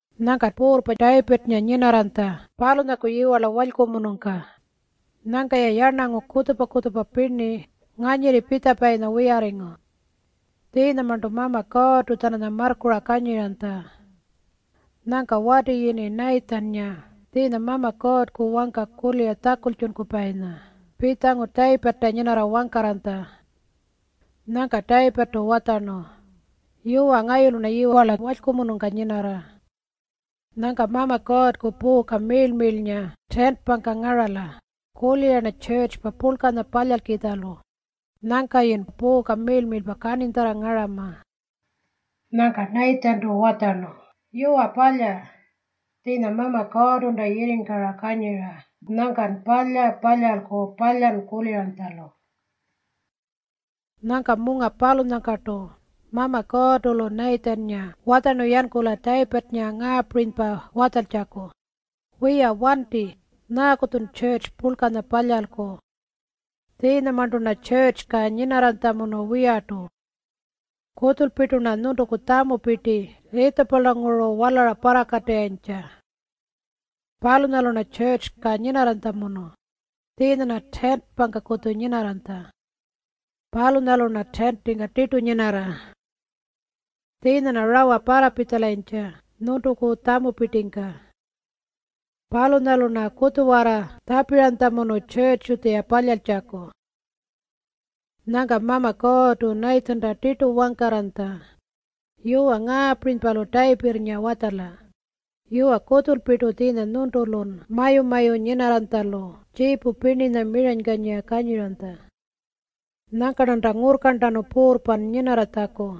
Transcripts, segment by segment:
Nyangka puurrpa Tayipirrnga nyinarranytja palunyaku yiwarla walykumunungka. Nyangka-ya yarnangu kutjupa-kutjupa pirni nganyirri pitjapayinya wiyarringu. Tjiinyamarntu Mama Kuurrtu-tjananya marrkura kanyiranytja. Nyangka wati yini Nayitjinnga tjiinya Mama Kuurrku wangka kulira tjakultjunkupayinya pitjangu Tayipirrta nyinarra wangkarranytja. Nyangka Tayipirrtu watjarnu, “Yuwa, ngayulu-rna yiwarla walykumunungka nyinarra. Nyangka Mama Kuurrku puuka miirl-miirlnga tiintingka ngarala. Kulira-rna tjurrtju purlkanya palyalkitjalu. Nyangkayi puuka miirl-miirlpa kaninytjarra ngarama.” Nyangka Nayitjintu watjarnu, “Yuwa, palya. Tjiinya Mama Kuurrtunta yirringkara kanyira. Nyangkan palya palyalku palan kuliranytjalu.” Nyangka munga palunyangkartu Mama Kuurrtu-lu Nayitjinnga watjarnu yankula Tayipirrnga ngaapirinypa watjaltjaku, “Wiya wanti. Nyaaku-tjun tjurrtju purlkanya palyalku? Tjiinyamarntu-rna tjurrtjungka nyinarranytjamunu wiyartu. Kutjulpirtu-rna nyuntuku tjamupirti Yiitjipulanguru walara parrakatirrayintja. Palunyalu-rna tjurrtjungka nyinarranytjamunu. Tjiinya-rna tiintingkakutju nyinarranytja. Palunyalu-rna tiintingka tirtu nyinarra. Tjiinya-rna rawa parrapitjalayintja nyuntuku tjamupirtingka. Palunyalu-rna kutjuwarra tjapiranytjamunu tjurrtju-tjuya palyaltjaku.” Nyangka Mama Kuurrtu Nayitjinta tirtu watjaranytja, “Yuwa, ngaapirinypa-lu Tayipirrnga watjala, ‘Yuwa, kutjulpirtu tjiinya nyuntulun mayu-mayu nyinarranytjalu tjiipu pirninya miranykanyira kanyiranytja. Nyangka-rnanta ngurrkarntanu puurrpan nyinarratjaku.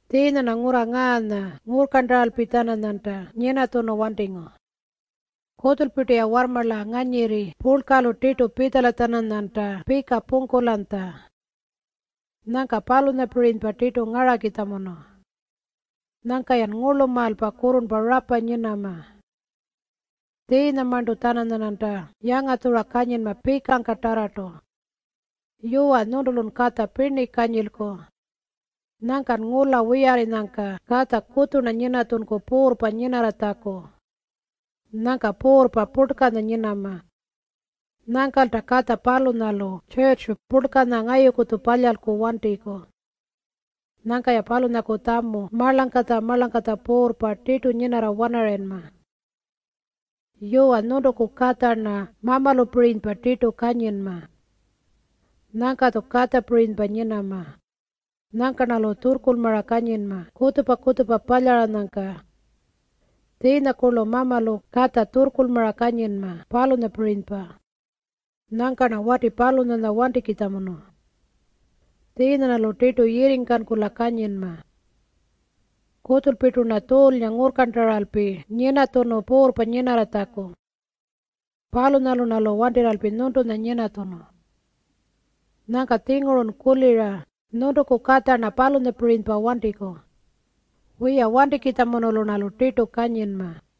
Tjiinya-rna ngurra ngaanya ngurrkarntaralpi-tjananyanta nyinatjunu wantingu. Kutjulpirtu-ya warrmarla nganyirri purlkalu tirtu pitjala-tjananyanta pika pungkulanytja. Nyangka palunyapirinypa tirtu ngarakitjamunu. Nyangka-yan ngurlumaalpa kurrurnpa rapa nyinama. Tjiinyamarntu-tjananyarnanta yangatjura kanyinma pikangkatarrartu. Yuwa, nyuntulun katja pirni kanyilku. Nyangkan ngula wiyarrinyangka katja kutju-rna nyinatjunku puurrpa nyinarratjaku. Nyangka puurrpa purlkanya nyinama. Nyangkalta katja palunyalu tjurrtju purlkanya ngayuku-tju palyalku wantiku. Nyangka-ya palunyaku tjamu marlangkatja-marlangkatja puurrpa tirtu nyinarra-wanarayinma. Yuwa, nyuntuku katja-rna mamalupirinypa tirtu kanyinma. Nyangka-tju katjapirinypa nyinama. Nyangka-rnalu tjurrkurlmara kanyinma kutjupa-kutjupa palyaranyangka. Tjiinyakurlu mamalu katja tjurrkurlmara kanyinma, palunyapirinypa. Nyangka-rna wati palunyanya wantikitjamunu. Tjiinya-rnalu tirtu yirringkankula kanyinma. Kutjulpirtu-rna Tjuulnga ngurrkarntaralpi nyinatjunu puurrpa nyinarratjaku. Palunyalu-rnalu wantirralpi nyuntunya nyinatjunu. Nyangka-tjingurun kulira nyuntuku katja-rna palunyapirinypa wantiku. Wiya, wantikitjamunulu-rnalu tirtu kanyinma.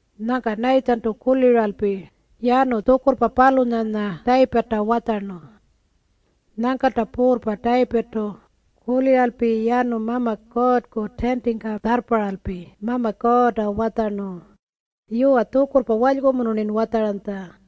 Nyangka Nayitjintu kuliralpi yanu tjukurrpa palunyanya Tayipirrta watjarnu. Nyangkalta puurrpa Tayipirrtu kuliralpi yanu Mama Kuurrku tiintingka tjarrparralpi Mama Kuurrta watjarnu, “Yuwa, tjukurrpa walykumunu-rnin watjaranytja.”